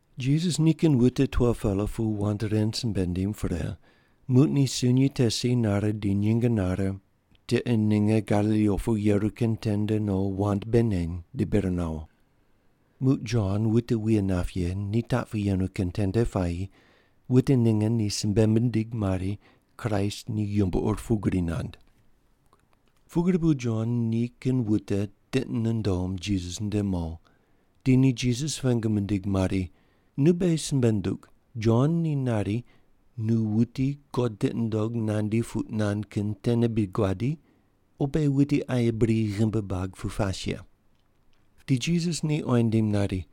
Jisas nikin wute 12-pela pu wand ren simbe nindim pre, muq ni sunyi te si nare di nyinge nare, tiqe ninge Galili opu yeru kin tende no wand bei neny di bir nawo. Muq Jon wute wuye nap ye ni taq pu yenu kin tende puayi wute ninge ni simbe mindig mari Kraist ni yumbo ur pugri nand. Pugri bu Jon nikin wute tiqi nundom Jisas nde mo, di ni Jisas pengu mindig mari, “Nu beghi simbe ndug, Jon ni nari nu, wuti God tiqi nundog nandi puq nand kin tene bri guadi o beghi wuti aye bri ghimbi buag pu pas ye?” Di Jisas ni oyi nindim nari,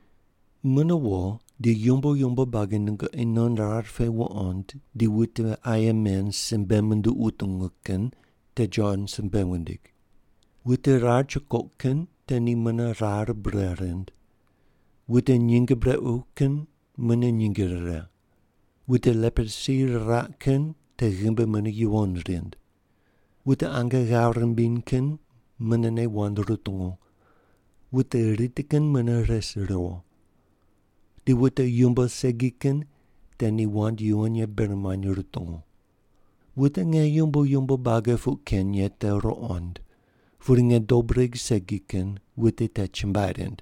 “Mune wo di yumbo yumbo buagi nungoqi non rar pe wuqond di wute aye men simbe munduq wutungu kin te Jon simbe wundig: Wute rar chukoq kin te ni mune rar bure rind, wute nyinge brequ kin mune nyinge rire, wute leprosi riraq kin te ghimbi mune yuwon rind, wute ange ghave rimbiny kin munene wand rutungu, wute riti kin mune res riwo, di wute yumbo segi kin te ni wand yuwon ye bir muany rutungu. Wute nge yumbo yumbo buagi puq ken ye te ruqond, pudi nge dob regh segi kin wute te chumbuai rind.”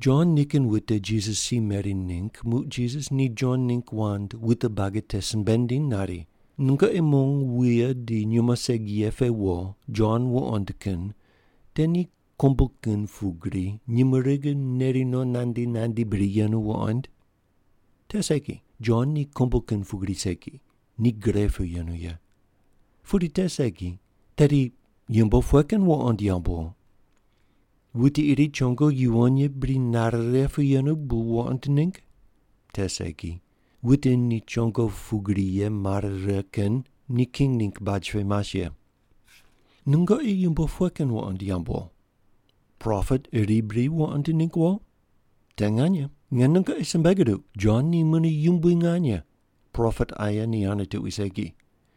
Jon nikin wute Jisas si meri ningg muq Jisas ni Jon ningg wand wute buagi te simbe nindiny nari, “Nungoqi mong wuye di nyumo segi ye pe wo Jon wuqoind kin te ni kombu kin pugri nyumurighi neri no nandi nandi bri yenu wuqoind? Te segi, Jon ni kombu kin pugri segi, ni gre pu yenu ye. Pudi te segi, tedi yumbo pughe kin wuqond yamb wo? Wuti iri chongo yuwon ye bri nare righe pu yenu bu wo wuqoind ningg? Te segi, wute ni chongo pugri ye mare righe kin ni king ningg baj pe mas ye. Nungoqi yumbo pughe kin wuqond yamb wo? Propet iri bri wuqoind ningg wo? Te nganyene, nge nungoqi simbe guduq, Jon ni mune yumbui nganye, propet aye ni ane tuqui segi.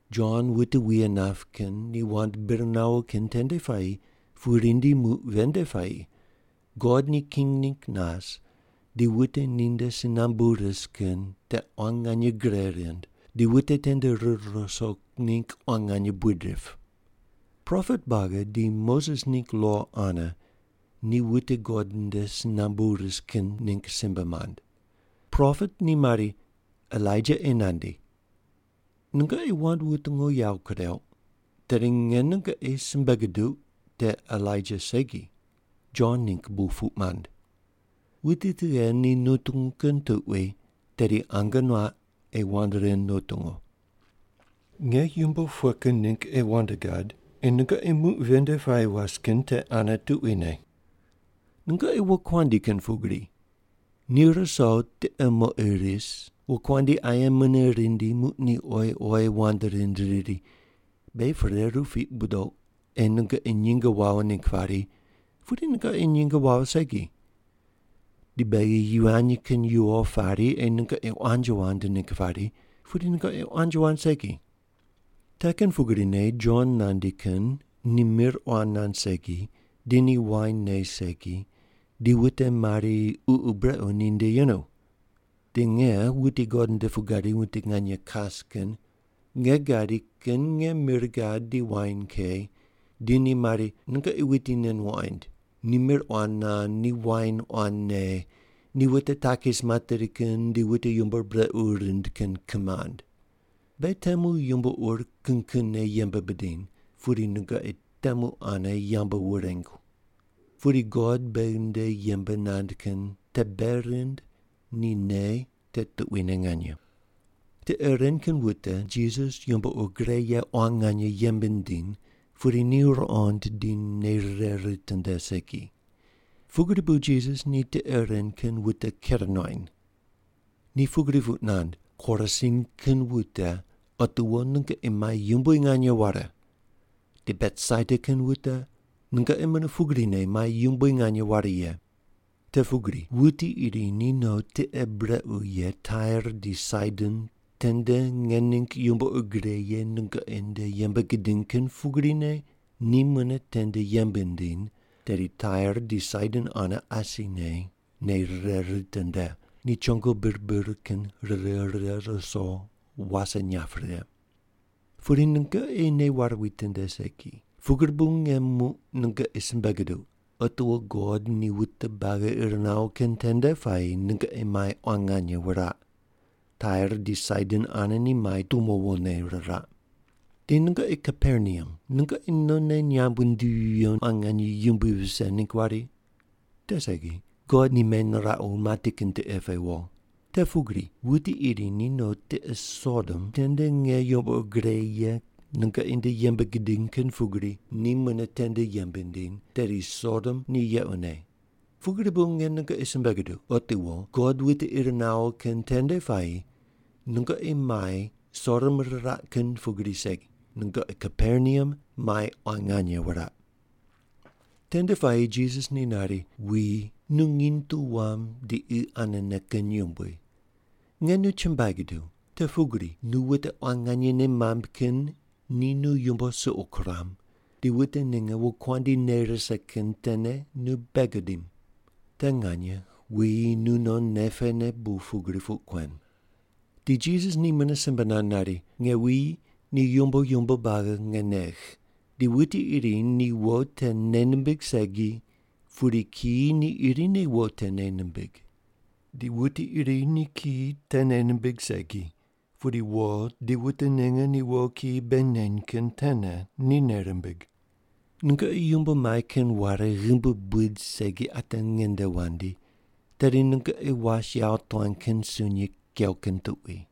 Jon wute wuye nap kin ni wand bir nawo kin tende puayi pu rindi muq ven nde puayi God ni king ningg nas di wute ninde si nambu ris kin te quan nganye gre rind di wute tende rir ruso ningg quan nganye buid rip. Propet buagi di Moses ningg lo ane ni wute God nde si nambu ris kin ningg simbe mand. Propet ni mari, ‘Elaija ei nandi.’ Nungoqi wand wutungu yawo kureuq, tedi nge nungoqi simbe guduq te Elaija segi, Jon ningg bu puq mand. Wuti tughe ni nutungu kin tuqui tedi ange nuaq ei wand ren nutungu. “Nge yumbo pughe kin ningg ei wand gad ei nungoqi muq ven nde puayi was kin te ane tuquine? Nungoqi wokuandi kin pugri, ni ruso tiqe moqi ris, wokuandi aye mune rindi muq ni oyi oyi wand rind riri, ‘Beghi pereru piq budouq ei nungoqi nyinge wawo ningg pari, pudi nungoqi nyinge wawo segi. Di beghi yivany kin yuwo pari ei nungoqi quanji wand ningg pari, pudi nungoqi quanji wand segi.’ Te kin pugrine Jon nandi kin ni mir quan nand segi, di ni wain ne segi, di wute mari ququ brequ ninde yenu. Di nge, wuti God nde pu gadi wuti nganye kas kin, nge gadi kin nge mir gad di wain ke di ni mari, ‘Nungoqi wuti nen wuqoind. Ni mir quan nand di wain quan ne, ni wute takis materi kin di wute yumbo ur brequ rind kin kimand.’ Beghi temu yumbo ur kin kinne yembe bidiny, pudi nungoqi temu ane yambu wurengu. Pudi God beghi nde yembe nand kin te bei rind ni nei te tuquine nganye.” Tiqe ren kin wute Jisas ni yumbo ur gre ye quan nganye yembe nindiny pudi ni te ruqond di nei rire ritinde segi. Pugri bu Jisas ni tiqe ren kin wute ker nuany. Ni pugri puq nand, “Korasin kin wute, otiwo nungoqi mai yumbui nganye ware, di Betsaida kin wute, nungoqi mune pugrine mai yumbui nganye ware ye. Te pugri wuti iri ni no tiqe brequ ye Tair di Saidon tende nge ningg yumbo ur gre ye nungoqi nde yembe gidiny kin pugrine ni mune tende yembe nindiny, tedi Tair di Saidon ane asine nei rire ritinde, ni chongo bir bir kin rire righe ruso wase inyap righe. Pudi nungoqi nei ware witinde segi, pugri bu nge muq nungoqi simbe guduq, otiwo God ni wute buagi ir nawo kin tende puayi nungoqi mai quan nganye wuraq. Tair di Saidon ane ni mai tumo wone riraq. Di nungoqi Kaperneam nungoqi nonne nyamb wundivi viyo quan nganye yumbui vise ningg wari? Te segi. God ni meniraqu mati kin tiqe pe wo. Te pugri wuti iri ni no tiqe Sodom tende nge yumbo ur gre ye nungoqi nde yembe gidiny kin pugrine ni mune tende yembe nindiny, tedi Sodom ni yequne. Pugri bu nge nungoqi simbe guduq, otiwo God ni wute ir nawo kin tende puayi nungoqi mai Sodom riraq kin pugri segi, nungoqi Kaperneam mai quan nganye wuraq.” Tende puayi Jisas ni nari, “Wuyi, nu nginy tu wam di qi anene kin yumbui. Nge nu chumbuai guduw, te pugri nu wute quan nganye nei mamb kin ni nu yumbo suqo kuram, di wute ninge wokuandi nei rise kin tene nu bei gudim. Te nganye wuyi nu non nei pene bu pugri puq kuen.” Di Jisas ni mune simbe nand nari, “Nge wuyi ni yumbo yumbo buagi nge negh. Di wuti iri ni wo te nei nimbig segi, pudi kiyi ni irine wo te nei nimbig. Di wuti iri ni kiyi te nei nimbig segi, pudi wo di wute ninge ni wo kiyi bei neny kin tene ni nei rimbig. Nungoqi yumbo mai kin ware ghimbi buid segi ate ngende wandi, tedi nungoqi was yawotuan kin sunyi kew kin tuqui.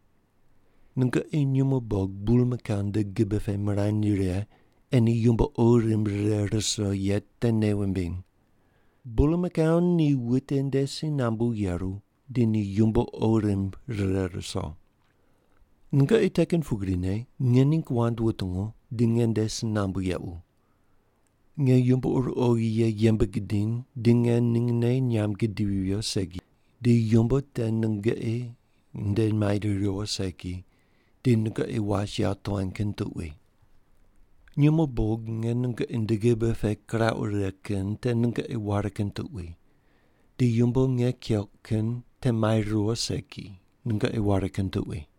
Nungoqi nyumo bog bulmakau nde gibe pe mirany righe ei ni yumbo qo rimb rire ruso ye te nei wumbiny. Bulmakau ni wute nde si nambu yeru di ni yumbo qo rimb rire ruso. Nungoqi te kin pugrine nge ningg wand wutungu di nge nde si nambu yequ. Nge yumbo ur oghi ye yembe gidiny di nge ningne nyamb gidivi viyo segi, di yumbo te nungoqi nde mai riwo segi, di nungoqi was yawotuan kin tuqui. Nyumo bog nge nungoqi nde gibe pe kirauq righe kin te nungoqi ware kin tuqui, di yumbo nge keuq kin te mai riwo segi, nungoqi ware kin tuqui.”